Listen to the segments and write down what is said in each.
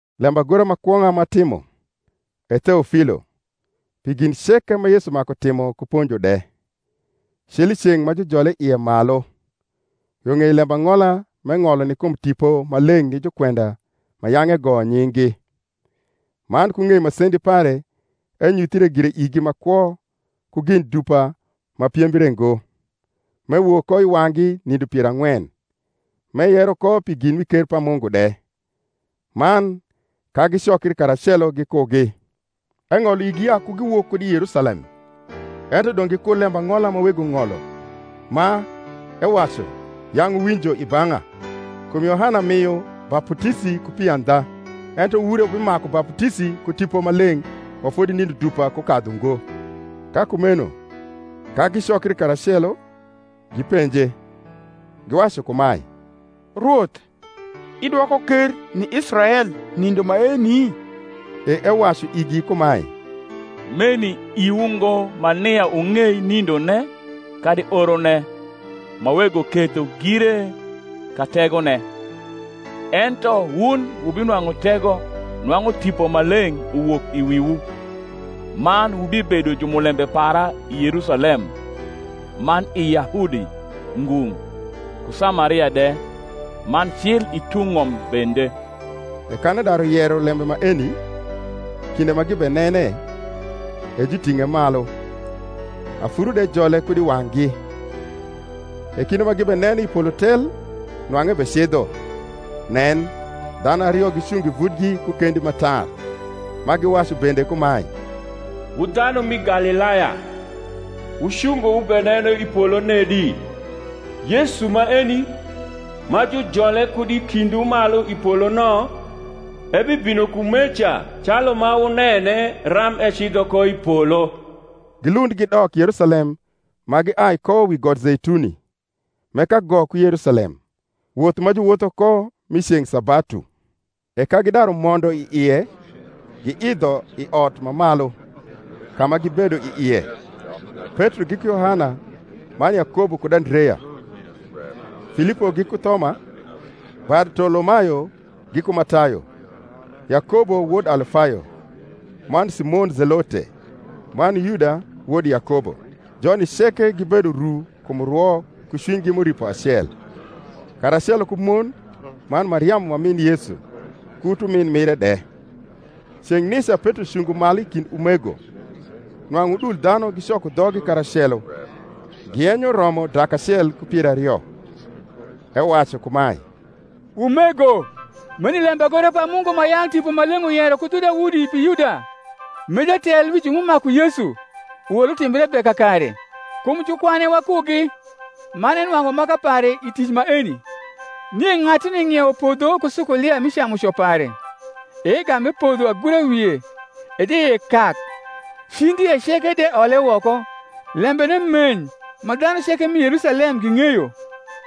Lembagora ma kwong’a m’atimo, E Theofilo, pi gin ceke ma Yesu maku timo ku ponjo de, cil i ceng’ ma jujole ie malu, yo ng’ei lembang’ola m’eng’olo ni kum Tipo Maleng’ ni jukwenda ma yang’ egoyo nying’gi: man ku ng’ei masendi pare enyuthre gire igi ma kwo ku gin dupa ma piembre ngo, m’ewok ko i wang’gi nindo pier ang’wen, m’eyero ko pi gin mi ker pa Mungu de: man, ka gicokri karacelo gikugi, eng’olo igi ya ku giwok kud i Yerusalem, ento dong’ gikur lembang’ola ma Wego ng’olo, ma, ewacu, yang’ wuwinjo i bang’a: kum Yohana mio baputisi ku pi andha ento wun re wubimaku baputisi ku Tipo Maleng’ ma fodi nindo dupa kukadhu ngo. Ka kumeno, ka gicokri karacelo, gipenje, giwacu kumae, Rwoth, idwoko ker ni Israel nindo maeni? E ewacu igi kumae, Meni iwu ngo ma nia wung’ei nindone kadi orone, ma Wego ketho gire ka tegone. Ento wun wubinwang’u tego, nwang’u Tipo Maleng’ uwok i wiwu: man wubibedo jumulembe para i Yerusalem, man i Yahudi ngung’ ku Samaria de, man cil i tung’ ng’om bende. E kan edaru yero lembe maeni, kinde ma gibenene, e juting’e malu; afuru de jole kud i wang’gi. E kinde ma gibeneno i polo tel nwang’u ebecidho, nen. dhanu ario gicungo i vutgi ku kendi ma tar; ma giwacu bende kumae, Wu dhanu mi Galilaya, wucungo wubeneno i polo nedi? Yesu maeni, ma jujole kud i kindwu malu i polo no, ebibino kumeca calu ma wunene ram ecidho ko i polo. Gilund gidok Yerusalem ma giai ko wi got Zeituni, m’e kago ku Yerusalem, woth ma juwotho ko mi ceng’ sabatu. E ka gidaru mondo i ie, giidho i ot ma malu, ka ma gibedo i ie; Petro giku Yohana man Yakobo kud Andrea, Filipo giku Thoma, Bartolomayo giku Matayo, Yakobo wod Alfayo, man Simon Zelote, man Yuda wod Yakobo. Joni ceke gibedo ru kum rwo ku cwinygi m’uripo acel, karacelo ku mon, man Mariamu ma min Yesu, ku utumin mire de. Ceng’ nica Petro cungo malu i kind umego, (nwang’u udul dhanu gicoko dhoggi karacelo, giyenyo romo dak acel ku pier ario,) ewacu kumae, Umego, meni lembagora pa Mungu ma yang’ Tipo Maleng’ uyero ku dhu Daudi pi Yuda, m’e jatel wi ju m’umaku Yesu, uol utimbre be kakare. Kum jukwane wakugi, man enwang’u maka pare i tic maeni. (Nie ng’atuni ng’iewo podho ku sukulia mi camuco pare, e egam epodho agura wie, e dieie kak, cindie ceke de ole woko. Lembene meny ma dhanu ceke m’i Yerusalem ging’eyo;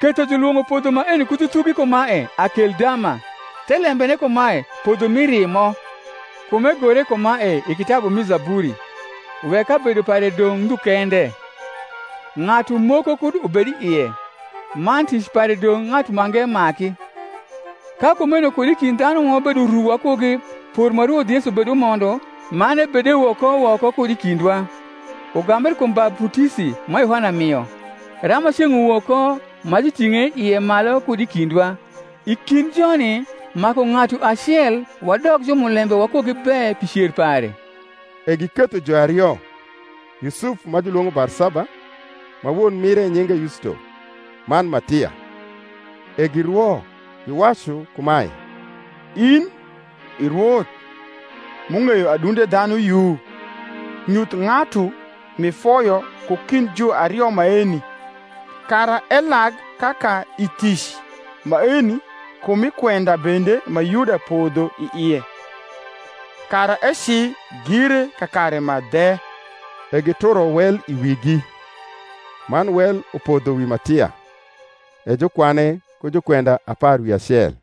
ketho julwong’o podho maeni ku dhu thugi kumae, Akeldama, thelembene kumae, Podho mi rimo.) Kum egore kumae i kitabu mi Zaburi, Wek kabedo pare dong’ ndhu kende, Ng’atu moko kud ubed i ie: man, Tic pare dong’ ng’atu mange maki. Ka kumeno kud i kind dhanu ma wabedo ru wakugi por ma Rwoth Yesu bedumondo man ebedewok ko woko kud i kindwa, ugambre kum baputisi ma Yohana mio, rama ceng’ uwok ko ma juting’e ie malu kud i kindwa, i kind joni maku ng’atu acel wadok jumulembe wakugi be pi cer pare. E giketho juario, Yusuf ma julwong’o Barsaba, ma won mire nyinge Yusto, man Matia. E girwo, giwacu kumae, In, i Rwoth, m’ung’eyo adunde dhanu yu, nyuth ng’atu m’ifoyo ku kind juario maeni, kara elag kaka i tic maeni ku mi kwenda bende ma Yuda podho i ie, kara eci gire kakare ma dhe. E gituro wel i wigi; man wel upodho wi Matia; e jukwane ku jukwenda apar wi acel.